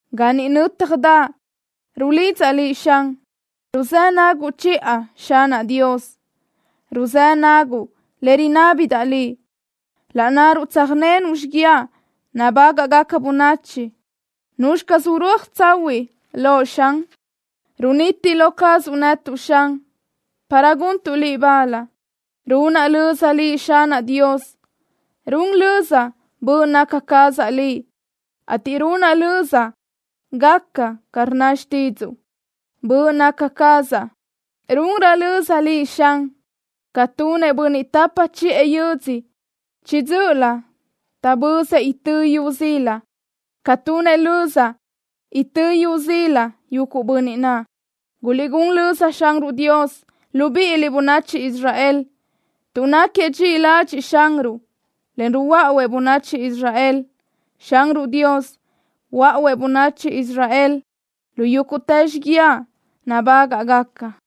Ga ni nö́tjadaʼ rulidzaʼ Liʼ, Xan. Ruzë́ naguʼ chiʼa, Xanaʼ Dios. Ruzëdaʼ naguʼ le rinábidaʼ Liʼ. Laʼ nnaruʼ tsöjnenuʼ xiguiaʼ nabágaʼgaca bönachi, ¿nuzxi caz urúaj tsahuiʼ loʼ, Xan? Runiti lo cazuʼ netuʼ, Xan, para guntuʼ Liʼ bal. Runaʼ löza Liʼ, Xanaʼ Dios. Run löza böʼ naca cazaʼ Liʼ, ateʼ runaʼ löza gaca ca rnna xtídzuʼu. Böʼ naca cazaʼ runrö löza Liʼ, Xan, ca tunëʼ bönniʼ tapa chiʼë yödzö chiʼi dzö́ʼölö taʼbözëʼ itö́ yu zila, ca tunëʼ löza itö́ yu zila yuguʼ bönniʼ naʼ. Guliʼgún löza Xanruʼ Dios, libíʼiliʼ, bönachi Israel, tuʼ náquiëʼ dxiʼi ladxiʼ Xanruʼ, en ruhuáʼuëʼ bönachi Israel. Xanruʼ Dios huöáʼuëʼ bönachi Israel lu yúguʼtë xiguiaʼ nabágaʼgaca.